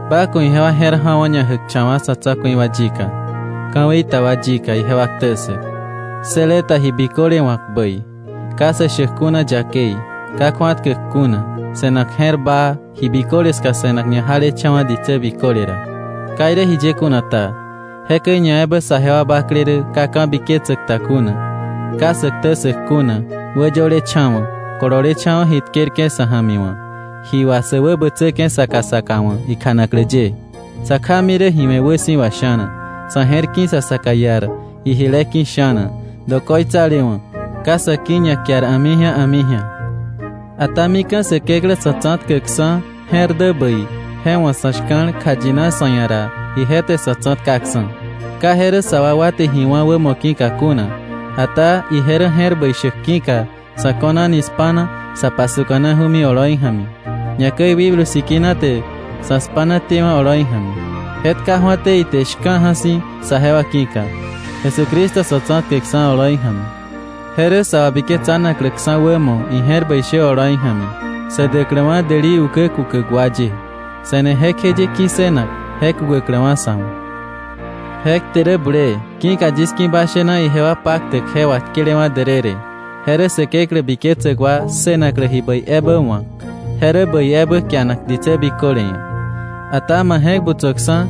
Ba ku̱ ijewa je̱r ja̱wo̱ ñajäkcha̱wa̱ sa̱ tsa̱ku̱i wa yika, ka̱wei ta wa yika ijewa ktä ssäk, ssële ta ji biköle wa̱k bäi, ka sä shäk kuna yakei, ka kju̱atkäk kuna, se̱nak je̱r baa, ji biköle ska se̱nak ñajalecha̱wa̱ ditsä biköle ra. Ka irä jiye kuna ta, jekäi ñaebä saje wa bakle rä ka ka̱biketsäk ta kuna, ka sä ktä ssäk kuna, wäyölecha̱wa̱, kololecha̱wa̱ ji tkerke̱ sa̱ ja̱mi wa̱, ji wà sä wäbätsäke̱ saka saka wa̱ ikjanaklä ye, sa kjami rä ji we̱ wäsi̱wa sha̱na, sa̱ je̱r ki̱ sa saka iar ijile ki̱ sha̱na, dokoitsalewa̱, ka sa̱ ki̱ ñakiar a̱mi ji̱a a̱mi ji̱a. Ata mika̱ Säkeklä Sa̱tsa̱tkäkksa̱ je̱r dä bäi, je wa̱ sa̱ shka̱l, kjayina sa̱ ia̱ ra, ije te sa̱ tsa̱tkaksa̱. Ka je rä sa wakwa te ji wá̱ wämo ki̱ka kuna, ata ije rä je̱r bäi shäk ki̱ka, sa̱ ko̱nani spa̱na sa pasuka̱naju̱mi oloi ja̱mi, ñakäi Wikblu Sikina te sa̱ spa̱na tewa̱ oloi ja̱mi. Je tkaju̱até ite shka̱ja̱ si̱ saje wa ki̱ka, Jesucristo Sa̱tsa̱tkäkksa̱ oloi ja̱mi. Je rä sa wabiketsanakläksa̱ wämo ije̱r bäi shä oloi ja̱mi, sä däkläwa̱ däli ukä kukäk wa ye, se̱ne jekjeye ki̱ssënak je kukäkläwa̱ sa̱ wa̱. Je kte rä bulee, ki̱ka yis ki̱ ba shena ijewa paktäk je wà tkelewa̱ därërë, je rä Säkeklä biketsäk wa ssënaklä ji bäi ebä wa̱k. Je rä bäi ebä kianak ditsä biköle ia̱. Ata ma je̱k butsöksa̱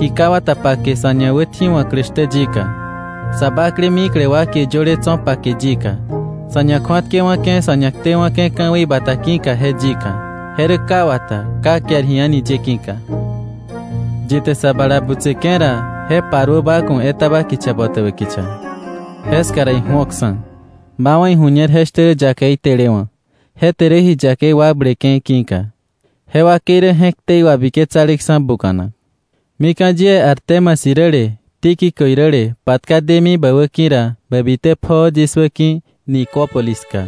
ji ka wata pake sa̱ ñawätji̱wa̱klä shtä yika, sa bakle mikle wa kie yöle tso̱ pake yika, sa̱ ñakju̱atkewa̱ke̱ sa̱ ñaktewa̱ke̱ ka̱wei bata ki̱ka je yika. Je rä ka wata, ka kiar ji a̱ni ye ki̱ka. Yi te sa bala butseke̱ ra, je paruö ba ku̱ etaba kicha botäbä kicha. Jeska ra iju̱oksa̱, ba wa̱ iju̱ñer je shtä rä yakei telewa̱, je te rä ji yakei wakbleke̱ ki̱ka. Je wakei rä je̱k ktei wabiketsaleksa̱ buka̱nak. Mika̱ yie Artemas iräle Tíquico iräle patka demi bä wäki̱ ra, bä bitä pjoo yis wäki̱ Nicópolis ska.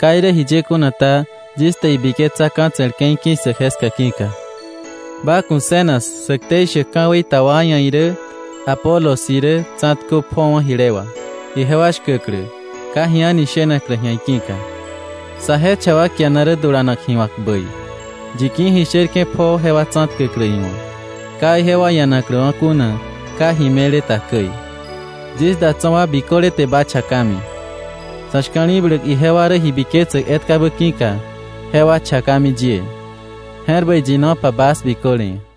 Ka irä jiye kuna ta, yis te ibiketsa ka̱tse̱l ke̱i ki̱ssäk jeska ki̱ka. Ba ku̱ Zenas sä ktei shäk ka̱wei ta wa ia̱ irä Apolos irä tsa̱tkö pjowa̱ jile wà, ijewa shkäklä, ka ji a̱ni shenaklä ji̱a iki̱ka. Saje cha wa kiana rä dulanak ji wa̱k bäi, yi ki̱ ji sherke̱ pjoo jewa tsa̱tkäklä iwa̱, ka ijewa ianakläwa̱ kuna ka ji me̱le ta käi. Yis da tso̱ wa biköle te ba chakami. Sa̱ shka̱li̱bläk ijewa rä ji biketsäk etkabä ki̱ka, jewa chakami yie. Je̱r bäi yinopa bas biköle ia̱.